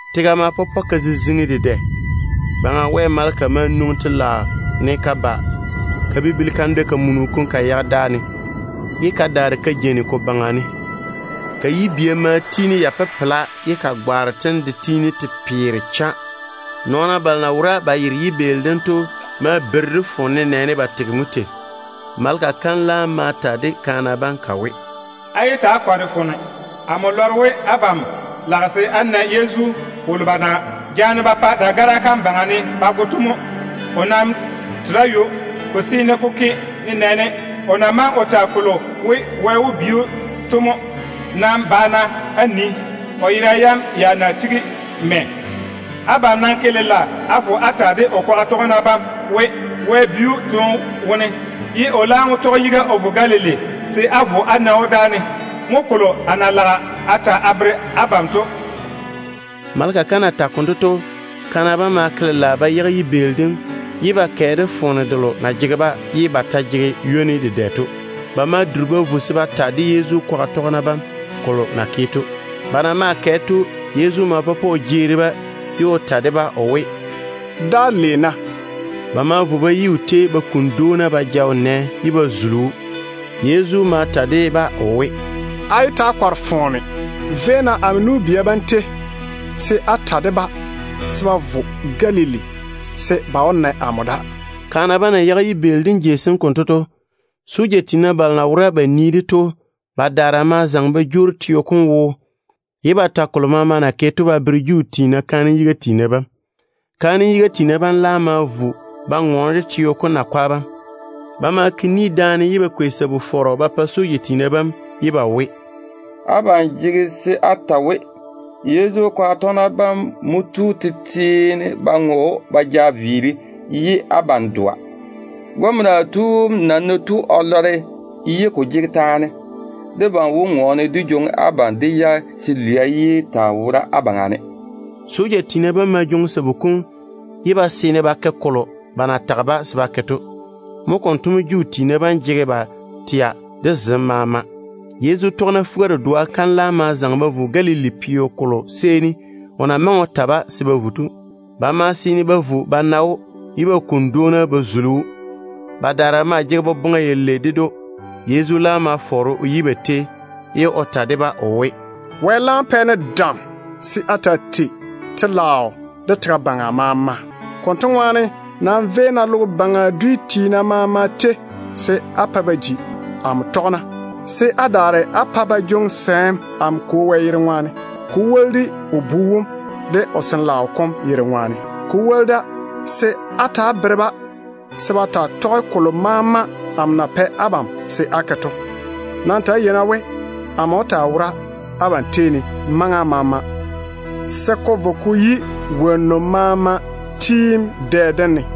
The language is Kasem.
Tega ma pɔpɔ ka ziziŋi dedɛ. Baŋa Wɛ maleka ma nwoŋi telaao ne ka ba ka bibili kandwɛ-kamunu kom ka yage dáa ne, ye ka daare ka jeini ko baŋa ne. Ka yibia maa tiini ya pepela, ye ka gwaaro tem de tiini te peere cha. Nɔɔna balo na wora ba yere yibeeli dem to ma beiri de foone nenɛɛne ba tege tei. Maleka kam laam ma ta de kaana bam ka we, “Yé ta‑á kɔre-na foone. A lɔre we abam lage se á na Yezu wolo ba na jaane ba pa dagara kam yuu ne ba go to mo. O nam tere ywo. Ko seene ko ke nenɛɛne o na wuuri o ta kolo we, Wɛ wó bi‑o to mo. Nam ba-na á nii o yera yam ya na tigi mɛ. Abam nam ke lela á vo á ta de o kwaga tɔgena bam we, Wɛ seene o bi‑o toone wone, ye o laam wó tɔge yiga o vo Galili se á vo á na‑o dáane. Mo kolo a na lage a ta a bere abam to.” Maleka kam na tage konto to, kaana bam ma ke lela ba yage yibeeli dem ye ba kɛ de foone delo na jege-ba ye ba ta jege ywoni dedɛ to. Ba ma duri ba vo se ba ta de Yezu kwaga tɔgena bam kolo na ke to. Ba na maa kɛ to, Yezu ma pɔpɔ o jeeri-ba, ye o ke ba lei. Ba ma vo ba yi o tei ba kuni dwoona ba ja o nɛ ye ba zuli‑o. Yezu ma ta de-ba o we, “Yé ta‑á kɔre-na foone. Véi-na amo nu-bia bam tei se á ta de-ba we, ba zaŋe ba vo Galili, se dáane mo ba wó na amo.” Kaana bam na yage yibeeli dem jei sem konto to, soja tiina balo na wora ba nii-de to badaara ma zaŋe ba jwoori teo kom wo, ye ba ta kolo maama na ke to ba bere Juu tiina kaanem yiga tiina bam. Kaanem yiga tiina bam laam ma vo ba ŋɔɔne de teo kom nakwa bam. Ba ma ke ni daane se ba kwei sabu-fɔrɔ ba pa soja tiina bam, ye ba we, “Abam jege se á ta we, Yezu kwaga tɔgena bam mo tu tete ne ba ŋɔ‑o ba ja viiri, de abam ta tigi á dɔa. Gɔmena tu wom nam ná tu o lɔre ko ni ne ye ko ke taane, debam wó ŋɔɔne dé jwoŋi abam dé yage se lwia yé taa wora á baŋa ne.” Soja tiina bam ma jwoŋi sabu kom ye ba seene ba ke kolo ba na tage-ba se ba ke to. Mo konto mo Juu tiina bam jege ba tɛa de zem maama. Yezu tɔgena fuga-dedoa bam laam ma zaŋe ba vo Galili peo kolo seeni o na maŋe o ta-ba se ba vo to. Ba ma seene ba vo ba na‑o, ye ba kuni dwoona ba zuli‑o. Badaara maa jege boboŋa yalei ded‑o. Yezu laam ma fɔɔre o yi ba tei, ye o ta de-ba o we, “Wɛ laam pɛ-ne dam se a taa tei telaao de tega baŋa maama. Konto ŋwaane nam véi-na logo baŋa dwi maama tei, se á pa ba ji amo tɔgena, se á daare á pa ba jwoŋi sɛɛm amo Kwo Wɛ yere ŋwaane, ko woli de o Bu wom de o Sin-laao kom yere ŋwaane. Ta‑á bere-ba se ba sɛ ba tɔge kolo maama amo na pɛ abam ni se á ke to. Nam ta‑á yei-na we, amo wó taa wora abam tei ne maŋa maama, se ko vo ko yi logo baŋa kweelim maŋa kam.”